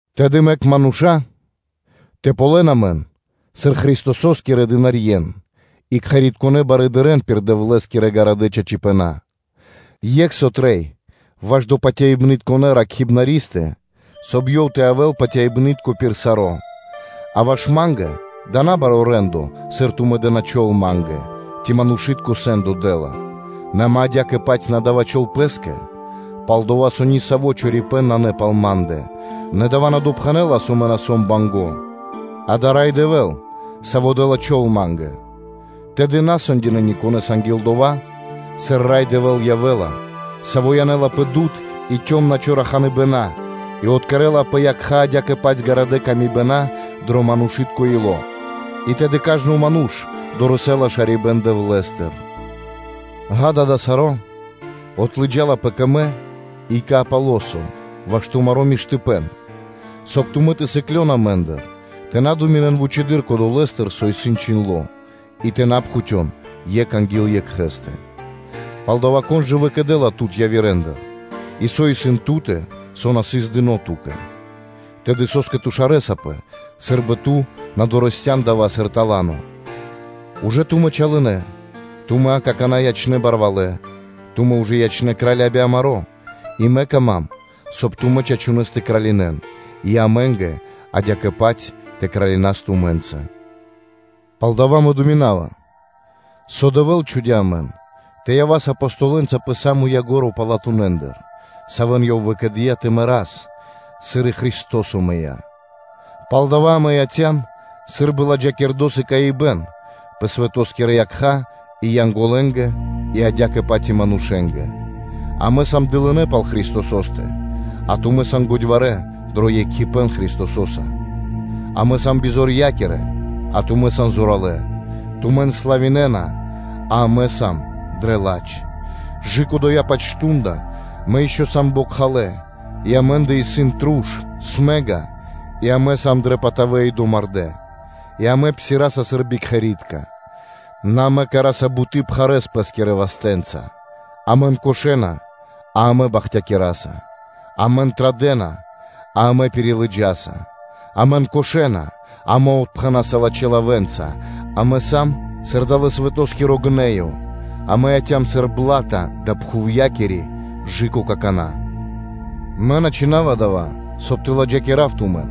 Тэды мэк мануша́ тэ ґалён амэн сыр Христосо́скирэ дынарье́н и кхэритконэ́ барыдырэ́н пир Дэвлэ́скирэ чораханэ чачипэна́. Екх со трэй ваш кхэритконэ́ барыдырэ́скэ, соб (кай) ёв тэ явэ́л патяибны́тко пир саро́. А ваш ма́нгэ дава́ исын набаро́ рэ́ндо, сыр тумэ́ дэ́на чол (тими́н) ма́нгэ, ци манушы́тко сэ́ндо дэ́ла. Нэ мэ адя́кэ-паць на дава́ чол пэ́скэ. Пал-дова́ со ни саво́ чорипэ́н нанэ пал ма́ндэ; нэ дава́ на допхэнэ́ла, со мэ на сом банго́: дава́ Рай Дэвэ́л, Саво́ дэ́ла чол ма́нгэ. Тэды на сэндякирэн анги́л дова́, сыр Рай Дэвэ́л явэ́ла, Саво́ дудвалякирэла (обсвэнцынэла) и калэ́ (цёмна) чораханыбэна и откэрэла пэ якха́ адя́кэ-паць ґарадэ́ мысли дро манушы́тко ило́; и тэды сва́ко (кажно) ману́ш дорэсэ́ла (долэла) шарибэ́н Дэвлэ́стыр. Ѓа́да, дава́ саро́, отлыджалапэ кэ мэ и кэ Аполосо ваш тумаро́ миштыпэ́н, соб (кай) тумэ́ тэ сыклён амэ́ндыр тэ на думинэн вучыдыр кодолэстыр, со исын чхиндло́, и тэ на пхутён екх анги́л екхэ́стэ. Палдава́, кон жа выкэдэ́ла тут явирэндыр? И со исын ту́тэ, со на сыс дыно́ ту́кэ? Тэды со́скэ ту шарэсапэ, сы́рбы ту на дорэсцян (на долыян) дава́ сыр тала́но? Тумэ́ ужэ чалынэ, тумэ́ акана́ ячнэ́ барвалэ́, тумэ́ ужэ ячнэ́ кральенца би амаро́; и мэ кама́м, соб (кай) тумэ́ чачунэ́с тэ кралинэн, и амэ́нгэ адя́кэ-паць тэ кралинав тумэ́нца. Палдава́ мэ думинава, со Дэвэ́л чхудя́ амэн тэ явас Апостолэнца пэ са́мо ко́нцо (яго́ро) палатунэндыр, савэ́н Ёв выкэдыя́ тэ мэрас, сыр и Христо́со мыя́. Палдава́ амэ яця́м сы́рбы ладжакирдо́ сыкаибэ́н (приме́ро) пэ свэто́скирэ якха́ и Янголэнгэ, адя́кэ-паць и манушэ́нгэ. Амэ сам дылынэ́ пал Христосо́стэ, а тумэ́ сан годьварэ́ дро екхипэ́н Христосо́са; амэ сам бизорья́кирэ, а тумэ́ сан зоралэ́; тумэн славинэна, а амэ сам дрэ ладж. Кэ дава́-паць мардо́ (шту́нда) мэ ишчо (инкэ́) сам бокхалэ́ и амэ́ндэ исын смэга (труш) и амэ сам дрэ патавэ и домардэ́, и амэ псираса сыр бикхэри́тка, нэ амэ кэра́са буты́ пхарэ́с пэ́скирэ вастэ́нца. Амэн кошэна, а амэ бахтякираса; амэн традэ́на, а амэ пирилыджаса; амэн кошэна, а амэ отпхэнаса лачхэ́ лавэ́нца, амэ сам сыр далэ́-свэтоскиро гнэё (мэста), амэ яця́м сыр бла́та далэ́ пхувья́кири кэ/жы́ко какана́. Мэ на чхина́ва дава́, соб (кай) тэ ладжакирав тумэн,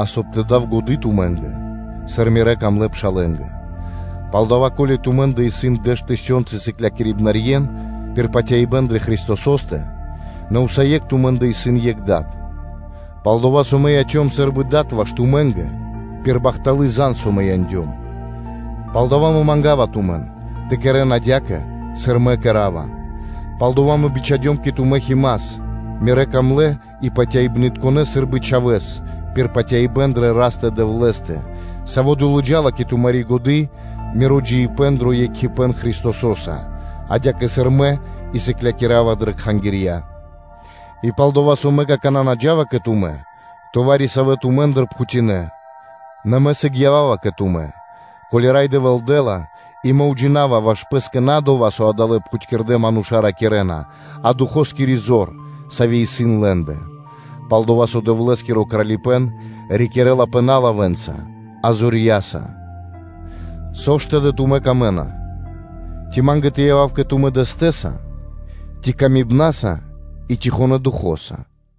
а соб (кай) тэ дав годы́ тумэ́нгэ, сыр мирэ́ дрогонэ́ пшалэ́нгэ. Палдава́, ко́ли тумэ́ндэ исын дэш тысёнцы сыклярьен (наставникэн) пир патяибэ́н дрэ Христосо́стэ, нэ усае́кх тумэ́ндэ исын екх дад; пал-дова́ со мэ яцём сы́рбы дад ваш тумэ́нгэ пир бахтало́ лав, со мэ яндём. Палдава́ мэ манга́ва тумэн, тэ кэрэ́н адя́кэ, сыр мэ кэра́ва. Пал-дова́ мэ бичхадём кэ тумэ́ Тимофеёс (Химас), мирэ́ дрогонэ́ и патяибнытконэ сы́рбы чхавэ́с пир патяибэ́н дрэ Растэ-Дэвлэ́стэ, саво́ долыджала кэ тумари́ годы́ миро джиибэ́н дро екхипэ́н Христосо́са, адя́кэ сыр мэ и сыклякирава дрэ кхангирья. И пал-дова́ со мэ какана́ на джа́ва кэ тумэ́, то вари-савэ́ тумэ́ндыр пхутинэ. Нэ мэ сыг ява́ва кэ тумэ́, ко́ли Рай Дэвэ́л дэ́ла, и мэ уджинава ваш пэ́скэ на дова́, со адалэ́ пхутькирдэ́ мануша́ ракирэ́на, а Духоскири зор, сави́ исын лэ́ндэ. Пал-дова́ со Дэвлэ́скиро Кралипэ́н рикирэ́лапэ на лавэ́нца, а Духо́скирэ зорья́са. Со ж тэды тумэ́ камэ́на? Ци ма́нгэ тэ явав кэ тумэ́ дэстэса ци ласкаса и тихонэ Духо́са?